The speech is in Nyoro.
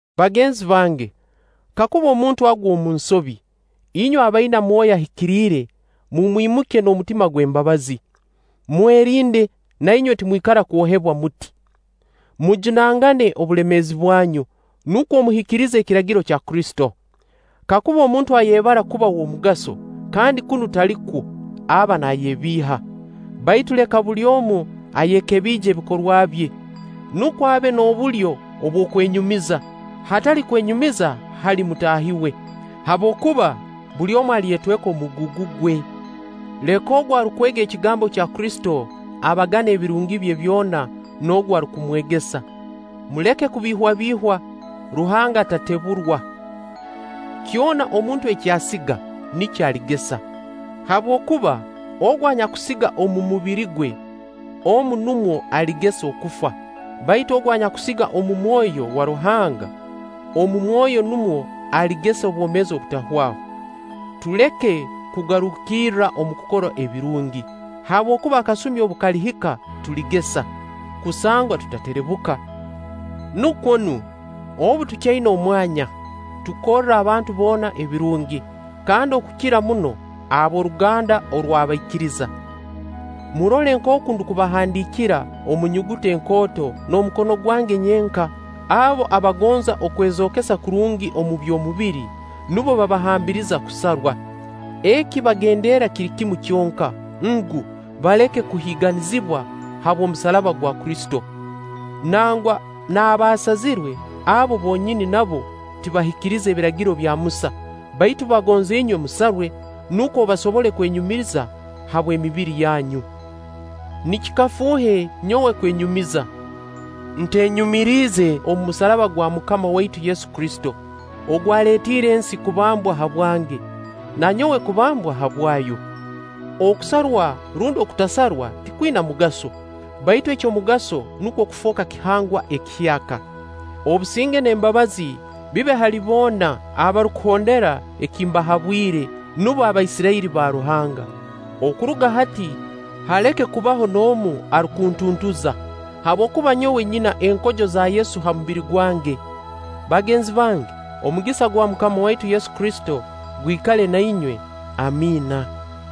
Bagenzi bange, kakuba omuntu agwa omu nsobi, inywe abaina Mwoyo Ahikiriire mumwimukye n'omutima gw'embabazi. Mwerinde, na inywe timwikara kwohebwa muti. Mujunangane obulemeezi bwanyu, nukwo muhikirize Ekiragiro kya Kristo. Kakuba omuntu ayebara kuba w'omugaso, kandi kunu talikwo, aba naayebiiha. Baitu leka buli omu ayekebiije ebikorwa bye, nukwo abe n'obulyo obw'okwenyumiza, hatali kwenyumiriza hali mutaahi we. Habwokuba buli omu alyetweka omugugu gwe. Leka ogu arukwega ekigambo kya Kristo, abagane ebirungi bye byona n'ogu arukumwegesa. Muleke kubiihwabiihwa; Ruhanga tateburwa. Kyona omuntu eki asiga, nikyo aligesa. Habwokuba ogu anyakusiga omu mubiri gwe, omu numwo aligesa okufa; baitu ogu anyakusiga omu Mwoyo wa Ruhanga, omu Mwoyo numwo aligesa obwomeezi obutahwaho. Tuleke kugarukirra omu kukora ebirungi, habwokuba akasumi obu kalihika tuligesa, kusangwa tutaterebuka. Nukwo nu, obu tukyaina omwanya, tukorre abantu boona ebirungi, kandi okukira muno abo ab'oruganda orw'abaikiriza. Murole nkooku ndukubahandiikira omu nyuguta enkooto n'omukono gwange nyenka. Abo abagonza okwezookesa kurungi omu by'omubiri, nubo babahambiriza kusarwa. Eki bagenderra kiri kimu kyonka ngu, baleke kuhiiganizibwa habw'omusaraba gwa Kristo. Nangwa n'abaasazirwe abo bonyini nabo tibahikiriza Ebiragiro bya Musa; baitu bagonza inywe musarwe, nukwo basobole kwenyumiriza habw'emibiri yanyu. Nikikafuuhe nyowe kwenyumiza, ntenyumiriize omu musaraba gwa MUKAMA waitu Yesu Kristo, ogwaleetiire ensi kubambwa habwange, na nyowe kubambwa habwayo. Okusarwa rundi okutasarwa tikwina mugaso, baitu eky'omugaso nukwo kufooka kihangwa ekihyaka. Obusinge n'embabazi bibe hali boona abarukuhondera eki mbahabwire, nubo Abaisirairi ba Ruhanga. Okuruga hati haleke kubaho n'omu arukuntuntuza; habwokuba nyowe nyina enkojo za Yesu ha mubiri gwange. Bagenzi bange, omugisa gwa MUKAMA waitu Yesu Kristo gwikale na inywe. Amiina.